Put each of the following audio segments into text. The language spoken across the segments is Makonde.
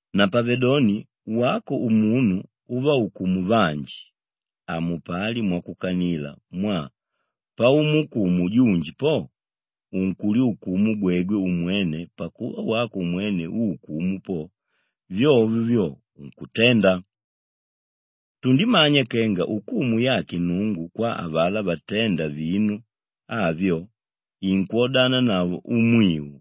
Napavedoni wako umunu úvaukumu vanji, hamupali mwakukanila mwaa paumuukumu junji po, unkulyukumu gwegwe umwene pakuva wako umwene úukumu po, vyovyo vyo unkutenda. Tundimanya kenga ukumu yake Nnungu kwa avalá vaténda vinu avyo, inkwodananavo umwiu.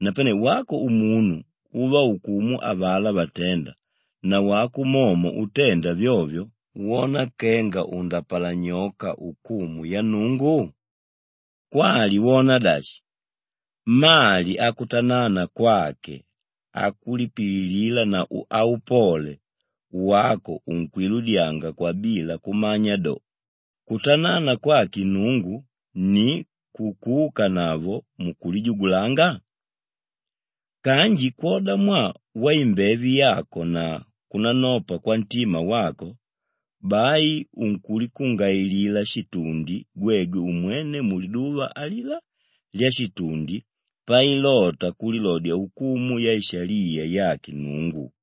Napane wako umunu úvaukumu avalá vaténda nawako momo utenda vyovyo, wona kenga undapalanyoka ukumu ya Nnungu? Kwali wona dashi, mali akutanana kwake, akulipililila na aupole, wako unkwiludyanga kwabila kumanya do, kutanana kwake Nnungu ni kukuukanavo mukulijugulanga? Kanji kwoda mwaa waimbeve yako na kunanopa kwantima wako, bai unkulikungailila shitundi gwegwe umwene muliduva alilá lyashitundi pailota kulilodya ukumu yaishaliya yake Nnungu.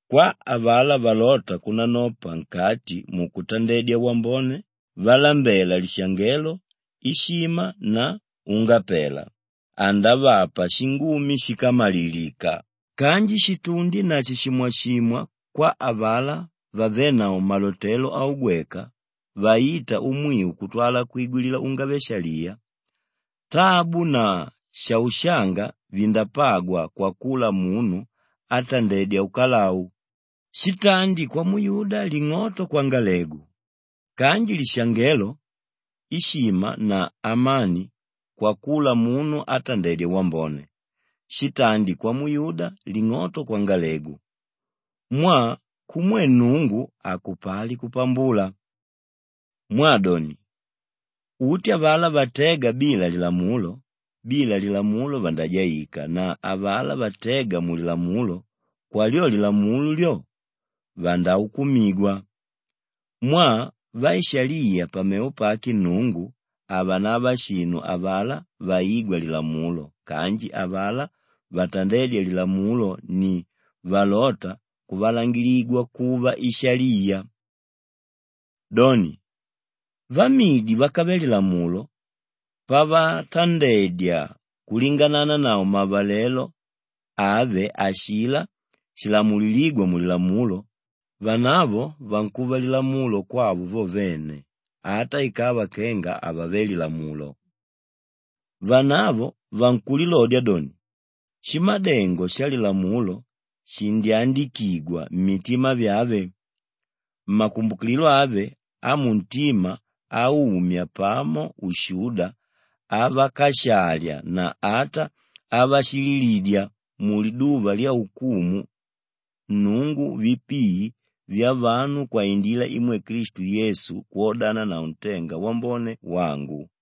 Kwa avalá valóta kunanopa nkati mukutandedya wambone, valambéla lishangelo, ishima na ungapela, andavapa shingumi shíkamalilika kanji shitundi na shishimwashimwa kwa avalá vavénavo malotelo augweka vaíta umwiu kutwala kwigwilila ungave-shaliya. Tabu na shaushanga vindapagwa kwakula munu átandedya ukalau; shitandi kwamuyuda ling'oto kwangalegu kanji lishangelo, ishima na amani kwakula munu átandedya wambone; shitandi kwamuyuda ling'oto kwangalegu. Mwaa kumwe Nnungu hakupali kupambula. Mwaa doni, uti avalá vatéga bila lilamulo, bila lilamulo vandajaika na avalá vatéga mulilamulo, kwa lyo lilamulo lyo, vandaukumigwa. Mwaa vaishaliya pamevo pake Nnungu havanava shinu avalá vaígwa lilamulo kanji avalá vatandédya lilamulo ni valóta kuvalangiligwa kuva ishaliya. Doni, vamidi vákave lilamulo pavatandedya kulingananavo mavalelo ave ashilá shilamulilígwa mulilamulo, vanavo vankuva lilamulo kwavo vo vene ata ikava kenga havave lilamulo. Vanavo vankulilodya doni shimadengo shalilamulo shindyandikigwa mmitima vyave; makumbukililo ave amuntima aumya pamo ushuda avakashalya na ata avashililidya muliduva lyaukumu Nnungu vipii vyavanu kwaindila imwe Klistu Yesu kwodananavo ntenga wambone wangu.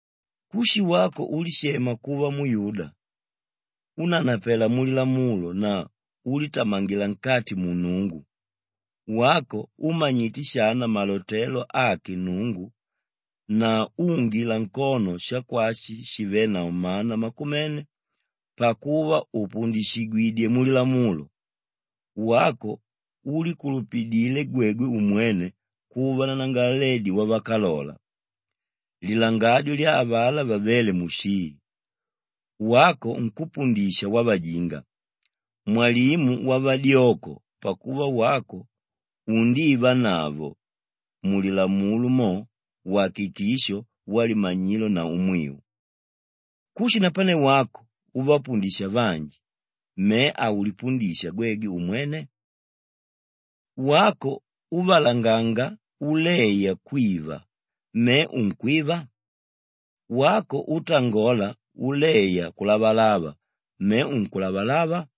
Kushi wako úlishema kuva muyuda, únanapela mulilamulo na úlitamangila nkati mu Nnungu, wako úmanyite shana malotelo ake Nnungu na úungila nkono shakwashi shivénavo mana makumene pakuva upundishigwidyé mulilamulo, wako úlikulupidile gwegwe umwene kuva nanangalaledi wavakalola, lilangadyo lya avalá vavéle mushii, wako nkúpundisha wavajinga, mwalimu wavadyoko pakuva wako undivanavo mulilamulo mo wakikisho walimanyilo na umwiu. Kushi napane wako úvapundisha vanji, me haulipundisha gwegwe umwene? Wako úvalanganga uleya kwiva, me unkwiva? Wako útangola uleya kulavalava, me unkulavalava?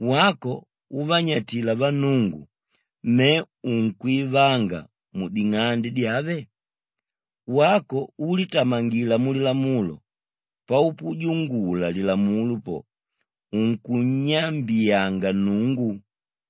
Wako úvanyatila vannungu, me unkwivanga muding'ande dyave? Wako úlitamangila mulilamulo, paupujungula lilamulo po, unkunnyambiyanga Nnungu.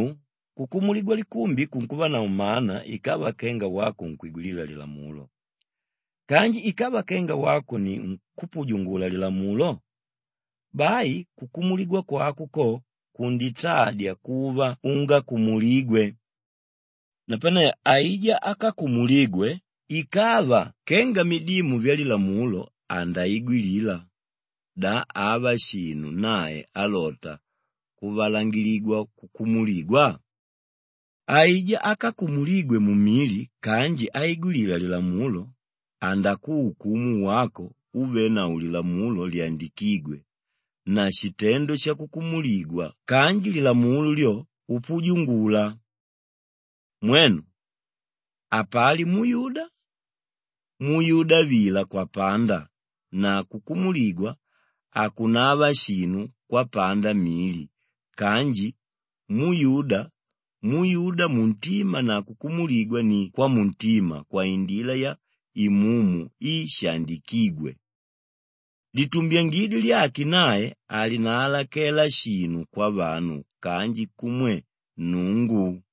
Mwiu, kukumuligwa likumbi kunkuvanavo mana ikava kenga wako unkwigwilila lilamulo kanji ikava kenga wako ni nkúpujungula lilamulo, bai kukumuligwa kwako ko kunditadya kuva ungakumuligwe. Napane aijá ákakumuligwe, ikava kenga midimu vyalilamulo andaigwilila, da ava shinu nae álota kuvalangiligwa kukumuligwa? Aijá ákakumuligwe mumili kanji áigwilila lilamulo, andakuukumu wako úvenavo lilamulo lyandikígwe na shitendo shakukumuligwa kanji lilamulo lyo, upujungula. Mwenu, hapali muyuda, muyuda vila kwapanda na kukumuligwa hakunava shinu kwapanda mili kanji muyuda, muyuda muntima na kukumuligwa ni kwamuntima kwaindila ya Imumu i shaandikígwe. Litumbyangidyo lyake nae halinaalakela shinu kwavanu kanji kumwe Nnungu.